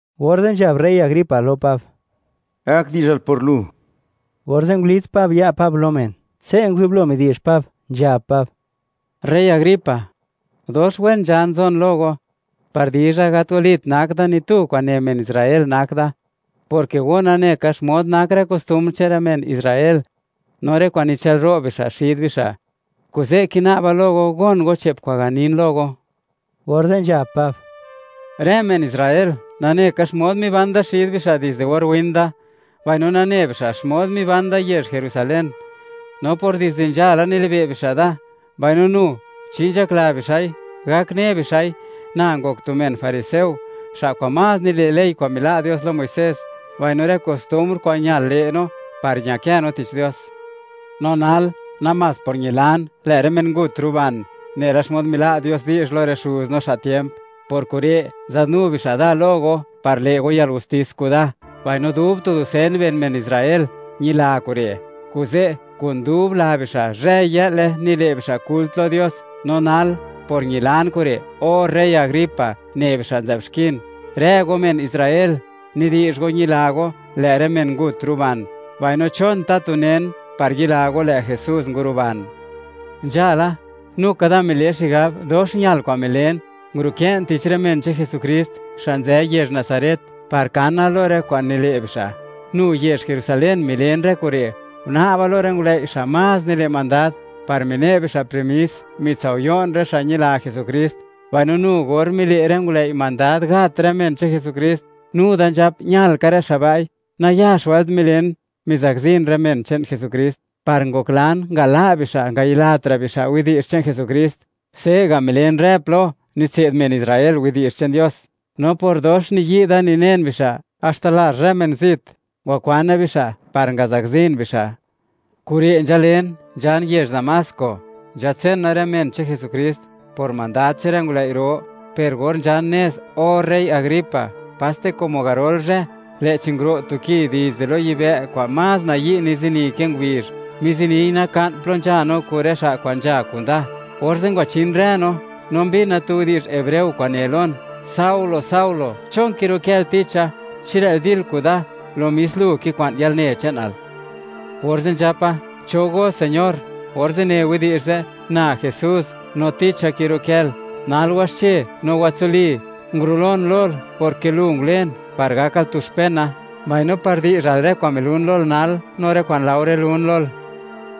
Orze' nzhab rey Agripa lo Pab: ―Gak di'zhal por lu. Orze' ngulits Pab ya' Pab lo men, se' nguzublo midi'zh Pab, nzhab Pab: ―Rey Agripa, dox wen nzhan nzon lo go, par dizha, gat walit nak da ni tu kwa'n ne men Israel nak da, porke go nane ka xmod nak rë kostumbr che'n rë men Israel, no rë kwa'n nichë'lro' bixa' xid bixa'. Kuze' kina'ba lo go gon go che'p kwa'n ganin lo go. Orze' nzhab Pab: ―Rë men Israel nane ka xmod miban da xid bixa' dizde or win da, mbaino nane bixa' xmod miban da yezh Jerusalén. No por dizde nzhala nilibe' bixa' da, mbaino nu, chi nzhakla bixa'i, gak ne bixa'i, na ngok tu men fariseo, xa' kwa'n más nile' ley kwa'n mila' Dios lo Muisés, mbaino rë kostumbr kwa'n ñal le' no par ñakë no tich Dios. No nal, namás por ñilan, lë' rë men ngut ruban, nela xmod mila' Dios di'zh lo rë xuz no xa' tiemp, por kure' nzadnu bixa' da lo go, par le' go yalgustis kuda. Mbaino dub tu dusen ben men Israel ñila kure'. Kuze' kun dub la bixa', zhëy-yë'le, nile' bixa' kult lo Dios. No nal, por ñilan kure', o rey Agripa, ne bixa' nzë'b xkin. Rë go men Israel, nidi'zh go ñila go, lë' rë men ngut ruban, mbaino, ¿chon tatu nen par yila go lë' Jesús nguruban? ’Nzhala, nu ka da mile xigab, dox ñal kwa'n milen, ngurukë'n tich rë men che'n Jesukrist, xa' nzë yezh Nazaret, par kana lo rë kwa'n nile' bixa'. Nu yezh Jerusalén milen rë kure'. Guna'ba lo rë ngulëi', xa' más nile' mandad, par mine' bixa' permis, mitsao'yo'n rë xa' ñila Jesukrist. Mbaino nu or mile' rë ngulëi' mandad gat rë men che'n Jesukrist, nu da nzhap ñal ka rë xa' ba'i. Nayax wëlt milen, mizakzin rë men che'n Jesukrist, par ngoklan ngala' bixa' ngayilatra' bixa' widi'zh che'n Jesukrist. Se'ga' milen rë plo nitse'd men Israel widi'zh che'n Dios. No por dox niyi' da ninen bixa', haxta lazh rë men zit ngwakwana bixa' par ngazakzin bixa'. ’Kure' nzhalen, nzhan yezh Damasco, nzhatsena rë men che'n Jesukrist, por mandad che'n rë ngulëi' ro. Per or nzhan nez, O rey Agripa, paste como garol zhë, lë'chi nguro' tu ki dizde lo yibë' kwa'n más nayi' nizini ke ngubizh, miziniy naka'n plo nzhan kun rë xa' kwa'n nzha kuda. Orze' ngwachin rë no, no mbina tu widi'zh hebreo kwa'n ne lon: “Saulo, Saulo, ¿chon kirukël ticha? Chi lë'l dil kuda, lo mis lu kikwa'n yalne che'nal.” Orze' nzhapa: “¿Cho go Señor?”, orze' ne widi'zh ze': “Na Jesús, no ticha kirukël. Nal waxche no watsuli. Ngurulon lol porke lu ngulen, par gakal tu xpena, mbaino par di'zhal rë kwa'n milun lol nal, no rë kwa'n laore lun lol.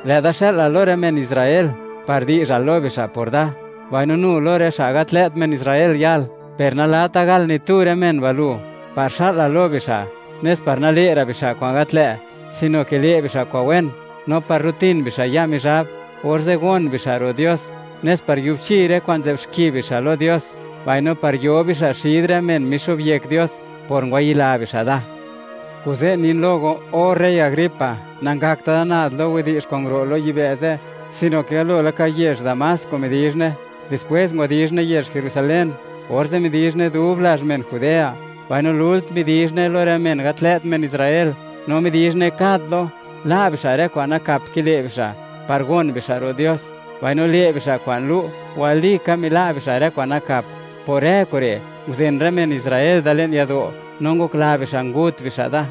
Lë'da xë'lal lo rë men Israel par di'zhal lo bixa' por da, mbaino nu lo rë xa' gat lë't men Israel yal; per nalata gal ni tu rë men ba' lu, par xa'lal lo bixa', nes par nale'ra' bixa' kwa'n gat lë', sino ke le' bixa' kwa'n wen; no par rutin bixa' ya' Mizhab, orze' gon bixa' ro' Dios; nes par yubchi rë kwa'n nzë'b xki bixa' lo Dios, mbaino par yo bixa' xid rë men mixo'byek Dios, por ngwayila bixa' Da.” ’Kuze' nin lo go, o rey Agripa, nangakta' da nad lo widi'zh kwa'n nguro' lo yibë' ze', sino ke galo laka yezh Damasco midizhne, dispwés ngwadizhne yezh Jerusalén, orze' midizhne dub lazh men Judea, mbaino lult midizhne lo rë men gat lë't men Israel; no midizhne kad plo, la' bixa' rë kwa'n nakap kile' bixa', par gon bixa' ro' Dios, mbaino le' bixa' kwa'n lu', walika mila' bixa' rë kwa'n nakap. Por rë kure', nguzen rë men Israel da le'n yado', no ngokla bixa' ngut bixa' da.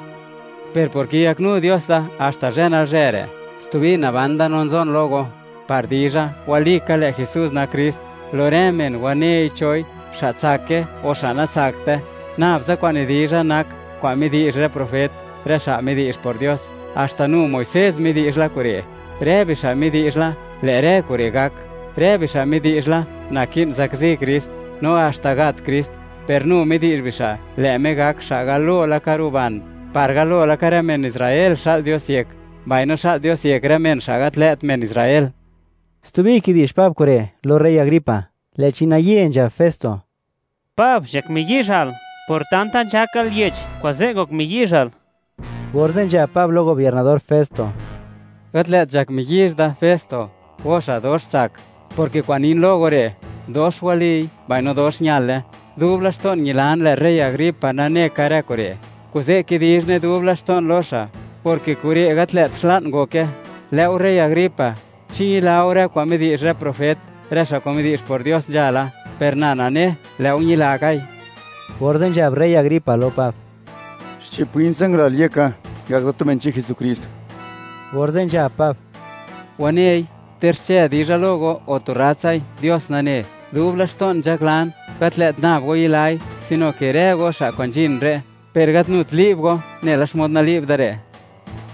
Per por kiyaknu Dios da haxta zhë nalzhë re'; stubi naban da no nzon lo go, par dizha, walika lë' Jesús nak Krist, lo rë men wanei choi, xa' tsake o xa' natsakte. Nabtsa kwa'n nidizha nak kwa'n midi'zh rë profet, rë xa' midi'zh por Dios, haxta nu Muisés midi'zh la kure'. Rë bixa' midi'zh la, lë' rë kure' gak. Rë bixa' midi'zh la, naki'n zakzi Krist, no haxta gat Krist. Per nu midi'zh bixa', lë' Me gak xa' galo laka ruban, par galo laka rë men Israel, xa'l Dios yek, mbaino xa'l Dios yek rë men, xa' gat lë't men Israel. Stubi kidi'zh Pab kure' lo rey Agripa, lë'chi naye nzhab Festo: ―¡Pab, nzhak miyizhal! ¡Por tanta nzhakal yech, kuze' ngok miyizhal! Orze' nzhab Pab lo gobiernador Festo: ―Gat lë't nzhak miyizh da, Festo, go xa' dox tsak; porke kwa'n nin lo go re' dox waliy, mbaino dox ñale. Dub laxto'n ñilan lë' rey Agripa nane ka rë kure', kuze' kidizhne dub laxto'n lo xa', porke kure' gat lë't xla'n ngoke. Lë'o, rey Agripa, ¿chi ñila go rë kwa'n midi'zh rë profet, rë xa' kwa'n midi'zh por Dios nzhala? Per na nane, lë'o ñila kai. Orze' nzhab rey Agripa lo Pab: ―Xche'p win tsa ngalal yeka ngak da tu men che'n Jesukrist. Orze' nzhab Pab: ―Wanei, ter xche dizha lo go o tu rratsai, Dios nane, dub laxto'n nzhaklan, gat lë't nab go yilai, sino ke rë go, xa' kwa'n nzhin re', per gat nut li'b go nela xmod nali'b da re'.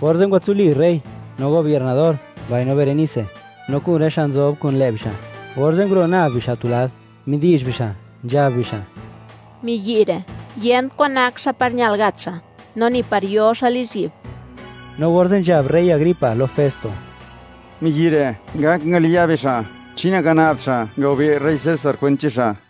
Orze' ngwatsuli rey, no gobiernador, mbaino Berenice, no kun rë xa' nzob kun lë' bixa'. Orze' nguro' nab bixa' tu lad, midi'zh bixa', nzhab bixa': ―Miyi' re', yent kwan nak xa' par ñal gat xa', no ni par yo xa' lizhyi'b. No orze' nzhab rey Agripa lo Festo: ―Miyi' re' ngak ngaliya' be xa' chi nangana'bt xa' ngagobe' rey César kwent che'n xa'.